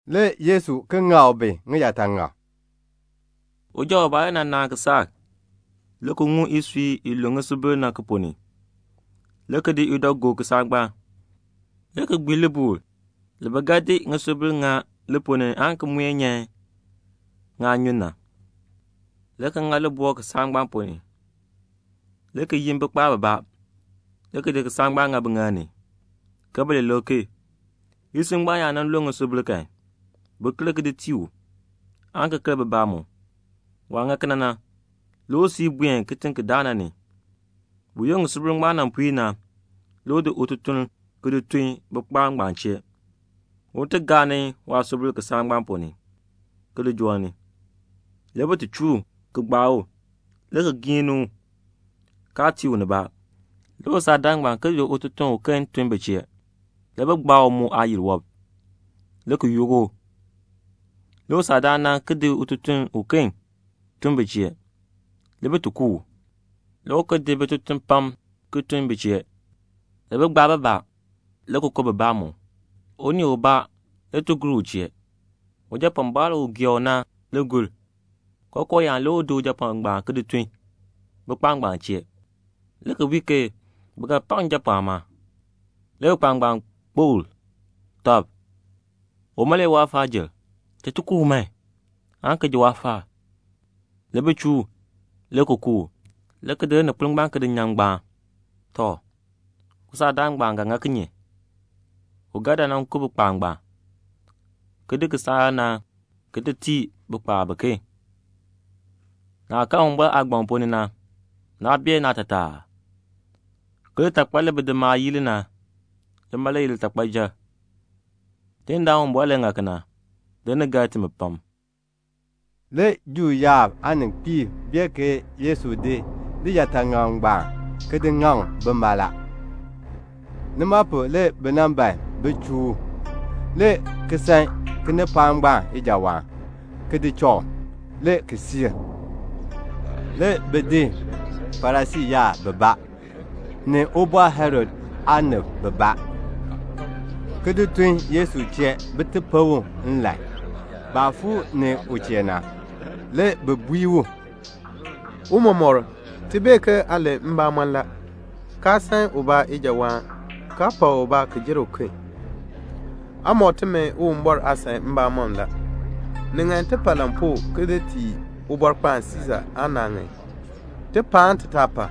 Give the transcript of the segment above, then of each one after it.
Le Yesu ki ŋak bi ŋiyaataŋak, "Uja ubaa le nan naan kisaak, le ki ŋum isui i lu ŋisubil na ki ponn ni, le ki di idɔ ki di gob kisaak ngbaan, le ki gbii libuul li bi ga di ŋisubil lii li ponn ni na aan ki muen ŋaanyun nyan, le ki ŋa libɔkl kisaak ngbaan ponn ni, le ki yin bikpaab bibaa, le ki di kisaak ngbaan ki di ŋa biŋaal ni, ke bi li lik ki. Isui ngbaan yaa nan lue ŋisubil kan, bin ker ki di tii u, aan ki ker bibaa mu. Waah ŋa kena na, le u siir ki buen kitiŋ ki daa na ni. Buyoonn ŋisubil ngbaan nan puir na, le u di ututuln ki di tun bikpaab ngbaan chee, un ti gaa ni waasubil kisaak ngbaan ponn ni, ki li joo ni. Le bi ti chuu u, ki gbaa u, le ki giin ni u, kaa tii u nibaa. Le usaakdaan ngbaan ki di ututuln uken ki ki di tun bi chee. Le bi gbaa u mu aayil wɔb, le ki yook u. Le usaakdaan na ki di ututuln uken ki ki di tun bi chee. Le bi ti ku u. Le u ki di bitutuliib pam ki tun bi chee; le bi gbaa bibaa, le ki ku bibaa mu. Unii ubaa le ti gur u chee. Ujapɔɔnbaan u u gee u na le gur. Kookoo yaan le u di ujapɔɔn ngbaan ki di tun bikpaab ngbaan chee, le ki bui ke, 'Bi ga pak njapɔɔn la.' Le bikpaab ngbaan kpokl tɔb, 'Uma le ye waafaajil. Cha ti ku u man, aan ki ji waafaal.' Le bi chuu u, le ki ku u, le ki di lininkpol ngbaan ki di nyan ngbaan. "Tɔ, usaakdaan ngbaan ga ŋa kinye? U ga dan nan ku bikpaab ngbaan, ki di kisaak na ki di tii bikpaab biken. Naah karn Uwumbɔr aagbaŋ ponn ni na, naa bee naatataa aa? ke 'Litakpal li bidimaab yii li na, lima le ye litakpayil. Tidindaan Uwumbɔr le ŋa kena, le ni gar timi pam."' Le Juu yaab aaninkpiib bee ke Yesu di liyaataŋakl ngbaan ki ŋaŋ bima la. Nima pu na le bi ban bin chuu u, le ki san kinipaak ngbaan ijawaan, le ki di cha u, le ki siir. Le bi di Farisii yaab bibaa, ni Ubɔr Herod aanib bibaa, ki di tun Yesu chee bin ti pen u nlan. Baah fuu ni u chee na, le bi bui u, "Tiicha, ti bee ke aa len mbamɔn la, kaa san ubaa ijawaan, kaa pak ubaa ki jer uken. Aa mɔk timi Uwumbɔr aasan mbamɔm la. Ni ŋan ti pa lampuu ki di tii Ubɔrkpaan Siisa aa naa ŋan? Ti pa aan ti taa pa?"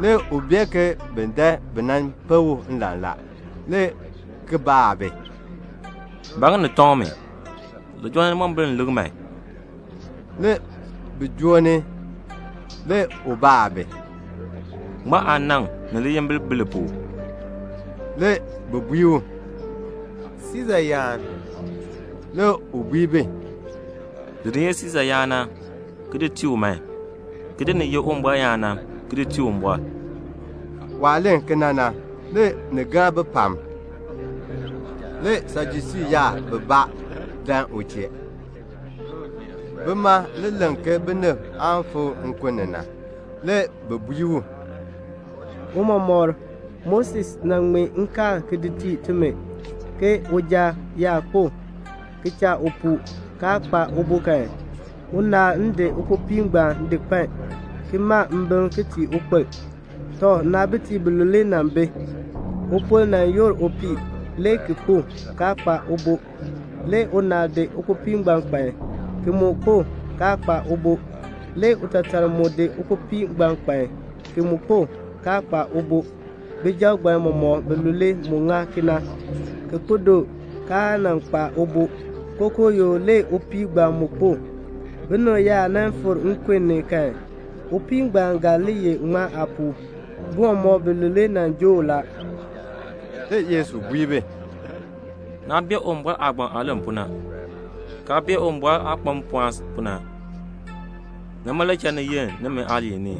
Le u bee ke bi ban bin pen u nlan la, le ki baa bi, "Ba ŋa ni tɔŋ mi? Li joo ni limombil m lik man." Le bi joo ni. Le u baa bi, "Ŋmaa aanaŋ ni liyimbil bi li pu?" Le bi bui u, "Siisa yaan." Le u bui bi, "Di ni ye Siisa yaan na, ki di tii u man, ki di ni ye Uwumbɔr yaan na, ki di tii Uwumbɔr." Waah len kena na, le ni gar bi pam. Le Sajusii yaab bibaa dan u chee. Bima le len ke binib aan fikr nkun ni. Le bi bui u, "Tiicha, Moses nan ŋmee nkaal ki di tii timi, ke 'Uja yaa kpo, ki di cha upuu, kaa kpa ubo kan, unaal n di ukpopii ngbaan di kpan, ki ma mbim ki tii ukpil.' Tɔ, naabitiib bilule nan bi. Upol nan yoor upii, le ki kpo, kaa kpa ubo. Le unaal di ukpopii ki di kpan, ki mu kpo, kaa kpa ubo. Le utaatar mu di ukpopii ngbaan di kpan ki mu kpo, kaa kpa ubo. Bijab ngbaan mɔmɔk bilule mu ŋa kena, ki kpo doo, kaa nan kpa ubo. Kookoo yoo le upii ngbaan mu kpo. Binib yaa nan fikr nkun ni kan, upii ngbaan ga li ye ŋmaa aapuu? Bi mɔmɔk bilule nan joo u la." Le Yesu bui bi, "Naa bee Uwumbɔr aagbaŋ aah len pu na, kaa bee Uwumbɔr aah kpa mpɔɔn pu na. Nima le cha ni yenn nimi aaliin ni.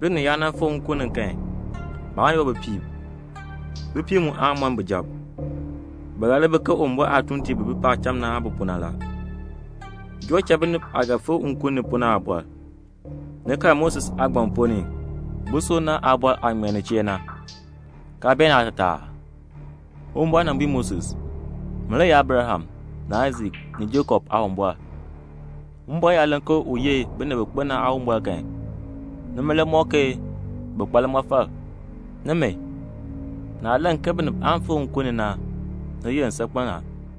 Binib yaa nan fikr nkun ni kan, baan yoor bipiib, bipiib mu aan mɔn bijab. Bi ga li bi ke Uwumbɔr aatuuntiib bi bi paacham na aah bi pu na la. Joo cha binib aah ga fikr nkun ni pu na aabɔr, ni karn Moses aagbaŋ ponn ni, busub ngbaan aabɔr aah ŋmee nin chee na, kaa bee naatataa aa? Uwumbɔr nan bui Moses, 'Min le ye Abraham ni Aisak ni Jakob Aawumbɔr.' Uwumbɔr yaa len ke u ye binib bi kpo na Aawumbɔr kan, nima le ŋmɔk ke bi kpa limɔfal. Nimi, naah len ke binib aan fikr nkun ni na, ni yenn saakpen a."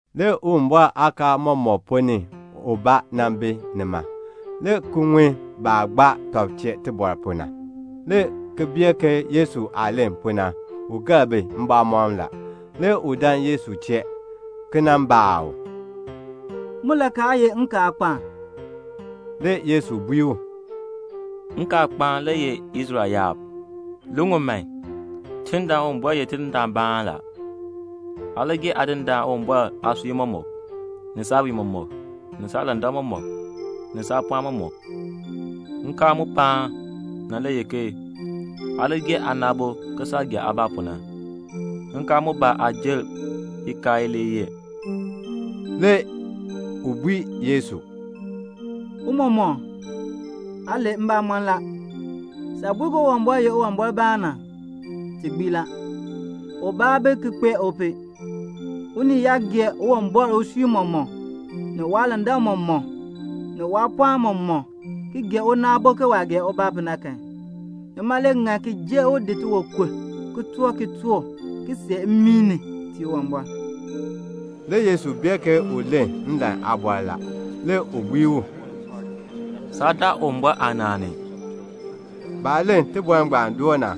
Le Uwumbɔr aakaal aamɔmɔkb ponn ni ubaa nan bi nima, le ki ŋun baah gbaa tɔb chee tibɔr pu na, le ki bee ke Yesu aah len pu na, u gar bi mbamɔm la. Le u dan Yesu chee, le ki baa u, "Mulakaal ye nkaalkpaan?" Le Yesu bui u, "Nkaalkpaan le ye 'Israel yaab, li ŋun man, Tidindaan Uwumbɔr ye Tidindaanbaan la. Aa li gee Aadindaan Uwumbɔr aasui mɔmɔk, ni saawiin mɔmɔk, ni saalandak mɔmɔk, ni saapɔɔn mɔmɔk.' Nkaal mu paan na le ye ke, 'Aa li gee aana aabo ke saah gee aabaa pu na.' Nkaal mbaa aa jer ikaal ilee yee." Le u bui Yesu, "Tiicha, aa len mbamɔn la. Saah bui ke Uwumbɔr ye Uwumbɔrbaan na, ti gbii la. Ubaa aa bi ki kpee u pu. Unii yaa gee Uwumbɔr usui mɔmɔk, ni waalandak mɔmɔk, ni waapɔɔn mɔmɔk, ki gee una aabo ke waah gee ubaa pu na kan, nima le ŋan ki jer u di tiwankur ki toor kitork ki see mmii ki tii Uwumbɔr." Le Yesu bee ke u len nlan aabɔr la. Le u bui u, "Saa daa Uwumbɔr aanaan ni." Baah len tibɔr ngbaan doo na,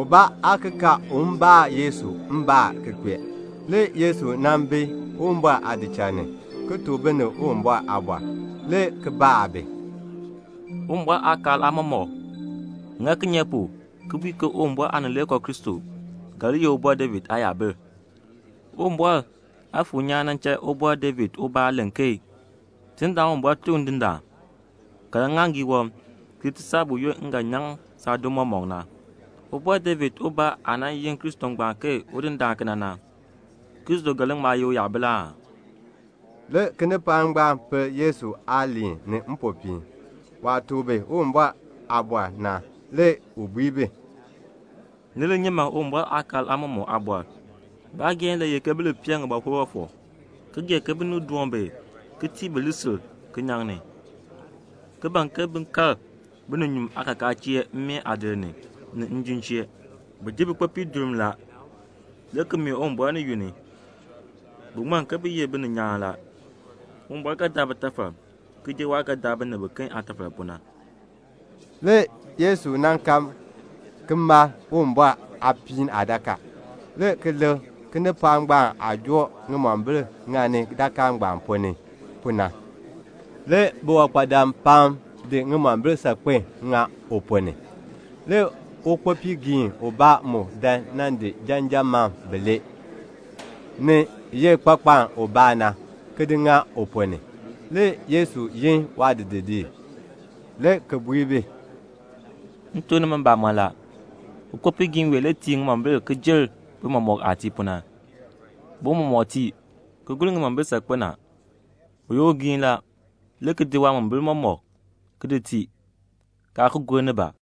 ubaa aa ki kaar un baa Yesu mbaan ki kpee. Le Yesu nan bi Uwumbɔr aadichal ni, ki tuk binib Uwumbɔr aaliin, le ki baa bi, "Uwumbɔr aakaal aamɔmɔkb ŋani kinye pu le ki bui ke Uwumbɔr Aanileekoo Kristo ye Ubɔr David aayabil? Uwumbɔr Aafuur nyaan nan cha Ubɔr David ubaa len ke 'Tidindaan Uwumbɔr tuk Ndindaan: Kaln ŋŋaaŋgii wɔb ki ti saa buyoonn m ga nyaŋ saadim mɔmɔk na.' Ubɔr David ubaa aah nan yin Kristo ngbaan ke Udindaan kena na, Kristo ga li ŋma ye uyabil aa?" Le kinipaak ngbaan pel Yesu aaliin ni mpopiin. Waah tuk bi Uwumbɔr aaliin na, le u bui bi, "Ni li nyi man Uwumbɔr aakaal aamɔmɔkb aabɔr. Baageehn le ye ke bi li pee ŋibɔkur fɔfɔk, ki gee ke binib doon bi ki tii bi lisil kinyaŋ ni, ki ban ke bin kal bininyuun aakakaa chee mmeen aadir ni, ni njim chee. Bi ji bikpopiib durm la, le ki mee Uwumbɔr ni yunn, bin ti ŋmann ke bi ye bininyaan la. Uwumbɔr ga daa bitafal ki jer waah ga daa binib biken aatafal pu na." Le Yesu nan kal ki mal Uwumbɔr aapiin aadakaa, le ki lik kinipaak ngbaan aah joo ŋimombil ki joo ŋani dakaa ngbaan ponn ni pu na. Le biwankpadam pam nan di ŋimombil saakpen ki di ŋa u ponn ni. Le ukpopiigiin ubaa mu dan nan di janjan mam bilee, ni ye kpakpaln ubaa na, ki di ŋa u ponn ni. Le Yesu yin waadidiliib, le ki bui bi, "M tuk nimi mbamɔn la, ukpopiigiin wee tii ŋimombil ki jer bi mɔmɔk aah tii pu na. Bi mɔmɔk tii, ki gur ŋimombil saakpen a. U ye ugiin la, le ki di waamombil mɔmɔk ki di tii, kaa ki gur nibaa."